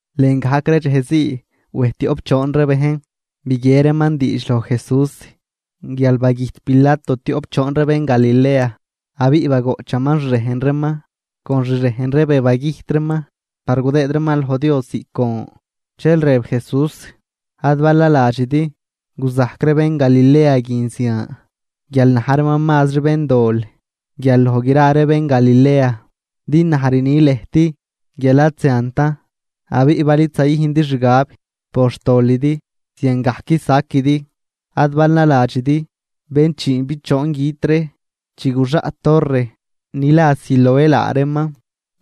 Lën gajc ree dxejzii wej tioꞌp choon ree bejn biguie reeman diidx loj Jesús guial bagüjt Pilato tioꞌp choon ree bén Galilea, abiꞌ bagoꞌchaman xrejn reeman con xrejn ree be bagüjt reeman par gudëëd reeman loj Dios ziꞌc gon. Dxel rëb Jesús: ―Ad bal naladxidi guzajc ree bén Galilea guin zian guial na̱j reeman mazri béndol guial loj gra ree bén Galilea. Din naj rni lëjt guial ad ziantan. Abiꞌ bal id zayüjndi xgab por xtolidi ziangajc saquidi. Ad bal naladxidi bén chiinbichoon güt ree chi guxaꞌt torre ni la Siloé laa reeman,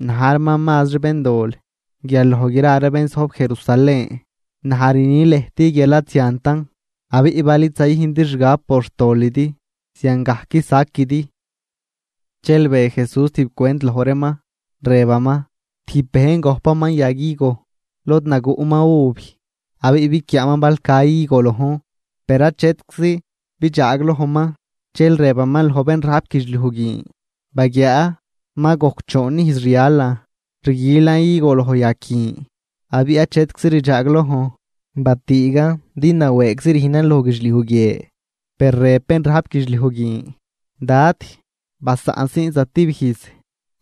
na̱j reeman mazri béndol guial loj gra ree bén zojb Jerusalén. Naj rni lëjt guial ad ziantan. Abiꞌ bal id zayüjndi xgab por xtolidi ziangajc saquidi. Dxel be Jesús tijb cwent loj reeman, rëbaman: ―Tijb bejn gojpaman yag higo lod naguꞌman uv, abiꞌ biquiaaman bal ca higo lojn, per achetczi bidxaaglojman. Dxel rëbaman loj bén rajp guidxliuj guin: “Baguiaa, ma gojc choon ijz rialan rguilan higo loj yag guin, abiꞌ achetczi rdxaaglojn. Batüügan din nawëëgzi rüjnan loj guidxliuj guie.” Per rëb bén rajp guidxliuj guin: “Dad, basaꞌnsiin zatib ijz,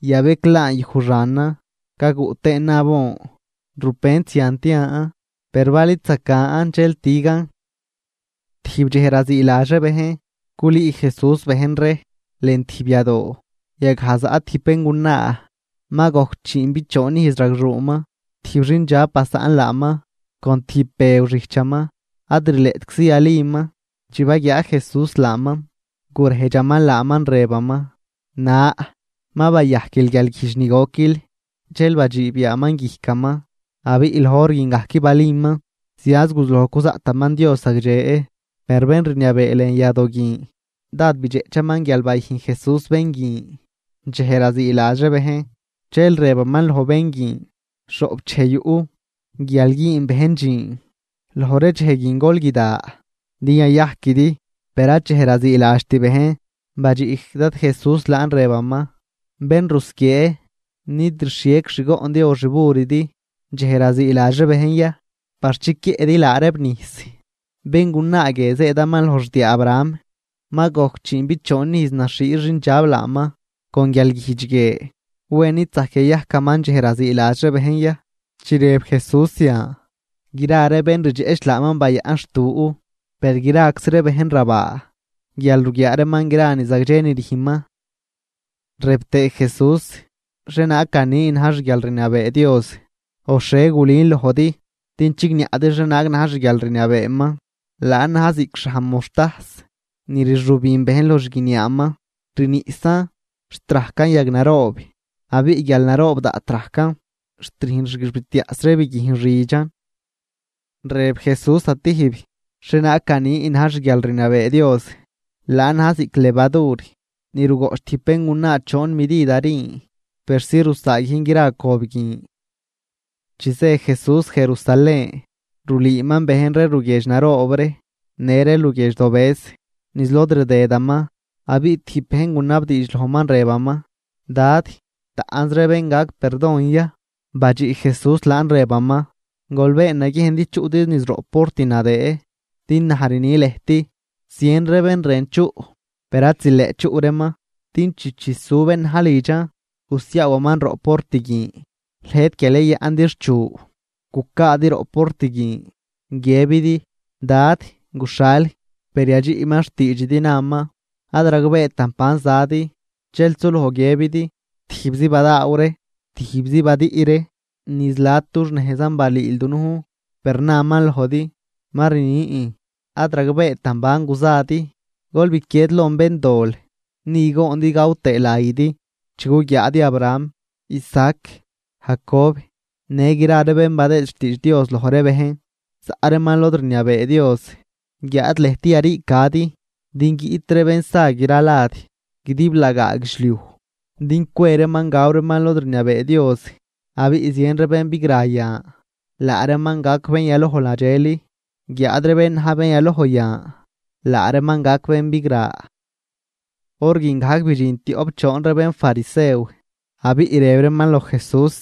yabeclaan yuj xanan gaguꞌ tëënan abon. Rupent zian tian, per bal id zacan dxel tügan.” Tijb dxej raziiladx ree bejn, culüü Jesús bejn ree lën tijb yadoo, yagaj zaꞌ tijb béngunaa ma gojc chiinbichoon ijz ragxuuman, tijb xindxab basaꞌn laaman con tijb bëw xijchaman, ad rileꞌtczi yaliman. Chi baguiaa Jesús laaman, gurejdxaman laaman, rëbaman: ―Na, ma bayajquil guialguijdx ni goquil. Dxel badxiib yaaman guijcaman; abiꞌ loj hor guin gajc baliman, zianz guzuloj cuzaꞌtaman Dios zagdxe. Per bén rniabee lën yadoo guin dád bidxeꞌchaman guial bayüjn Jesús bén guin dxej raziiladx ree bejn, dxel rëbaman loj ree bejn: ―Xhoꞌp dxej yuꞌ guial güün bejn dxiin, loj ree dxej guin gol guida din yayajquidi, per ad dxej raziiladxt bejn. Badxiꞌ Dad Jesús laan rëbaman: ―Bén rusquiee, ¿nid rxhiec xgoꞌndi o xburidi dxej raziiladx ree bejn ya par chiquiëꞌdi laa reeb nijs? Béngunaa guie zëëdaman loj xdiaa Abraham, ma gojc chiinbichoon ijz naxhii xindxab laaman con guialguijdx guie. ¿Wen id zajc yayajcaman dxej raziiladx ree bejn ya? Chi rëb Jesús zian, gra ree bén rdxeꞌch laaman bayaꞌn xtu; per graczi ree bejn rabaa guial ruguiaa reeman gra ree ni zagdxe ni rüjnman. Rëb tëë Jesús: ―¿Xhienaag ganin na̱j xguialrniabee Dios o xhie gulün lojdi din chigniaꞌdi xhienaag na̱j xguialrniabeeman? Laan na̱j ziꞌc xhaj moxtajs ni rxübin bejn loj xguiniaaman, rniꞌsan xt rajcan yag naroob. Abiꞌ guial naroob daꞌt rajcan xt rüjn xguixbitiaꞌs ree biguijn xidxan. Rëb Jesús zatijb: ―¿Xhienaag ganin na̱j xguialrniabee Dios? Laan na̱j ziꞌc levadur ni rugoꞌch tijb béngunaa choon midid harin persi rusaaguijn gra cob guin. Chi zë Jesús Jerusalén, rulüüman bejn ree luguiedx naroob ree në ree luguiedx dobëz niz lod rdëdaman. Abiꞌ tijb bejn gunabdiidx lojman rëbaman: ―Dad, ¿taꞌnz ree bén gac perdon ya? Badxiꞌ Jesús laan rëbaman: ―Gol been naguiejn din chuꞌdi niz roꞌ port nadëë, din naj rni lëjt, zien ree bén rën chuꞌ, per ad zileꞌt chuꞌ reeman. Din chi chisu bén na̱j lidxan gusiaawaman roꞌ port guin, lëjt guial yayaꞌndi xchu, gucaadi roꞌ port guin guiëbidi: “Dad, guxhal.” Per yadxiꞌman xtiidxidi naman: “Ad ragbeetan ban zadi.” Dxel suloj guiëbidi: “Tijbzi badaaw ree, tijbzi badüꞌ ree, niz la̱d dux nejzan balüül dunujn.” Per naman lojdi: “Ma rnin, ad ragbeetan ban guzadi. Gol biquied lon béndol.” Ni goondi gaw tëë layidi chi guguiaadi Abraham, Isaac, Jacob, në gra ree bén badëë xtiidx Dios loj ree bejn, zaꞌ reeman lod rniabee Dios, guiáad lëjt yariicadi. Din guiꞌt ree bén sa gra lad guidiblagaa guidxliuj din cwe reeman gaw reeman lod rniabee Dios. Abiꞌ zien ree bén bigra yan, laa reeman gac bén yaloj nadxel. Guiáad ree bén na̱j bén yaloj yan, laa reeman gac bén bigra. Hor guin gajc bidxin tioꞌp choon ree bénfarisew, abiꞌ rëb reeman loj Jesús: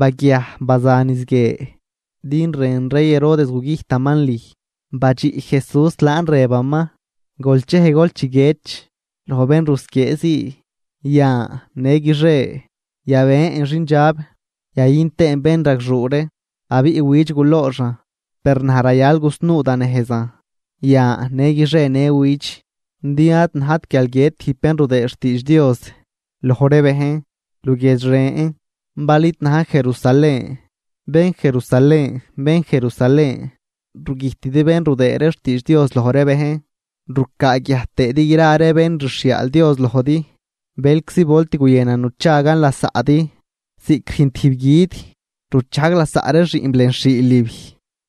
―Baguiaj, baza niz guie, din rën rey Herodes gugüjtaman lüj. Badxiꞌ Jesús laan rëbaman: ―Gol chej gol chiguiedx loj bén rusquiee zii: “Yan, në guixie yabën xindxab yayün tëën bénragxuu ree, abiꞌ widx gulooxan.” Per naj rayal gusnuu da nejzan yan në guixie në widx, din ad najt guial guiët tijb bén rudëë xtiidx Dios loj ree bejn luguiedx ren bal id najn Jerusalén. ’¡Bén Jerusalén, bén Jerusalén, rugüjtidi bén rudëë ree xtiidx Dios loj ree bejn rucaaguiaj tëëdi gra ree bén rxhiaal Dios lojdi! ¡Bëlczi volt guyënan nuchagan lasaꞌdi ziꞌc rüjn tijb guid ruchajg lasaꞌ ree xiꞌnb lën xhiilib,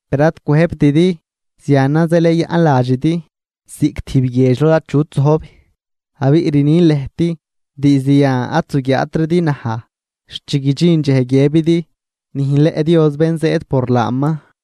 per ad cwëjbtidi! Zianan zeel yayaꞌn ladxidi ziꞌc tijb guiedx lod achut zojb. Abiꞌ rnin lëjt, diizd yan ad zuguiaatridi naj xt chi guidxin dxej guiëbidi: “¡Nüjnleꞌ Dios bén zëëd por laaman!”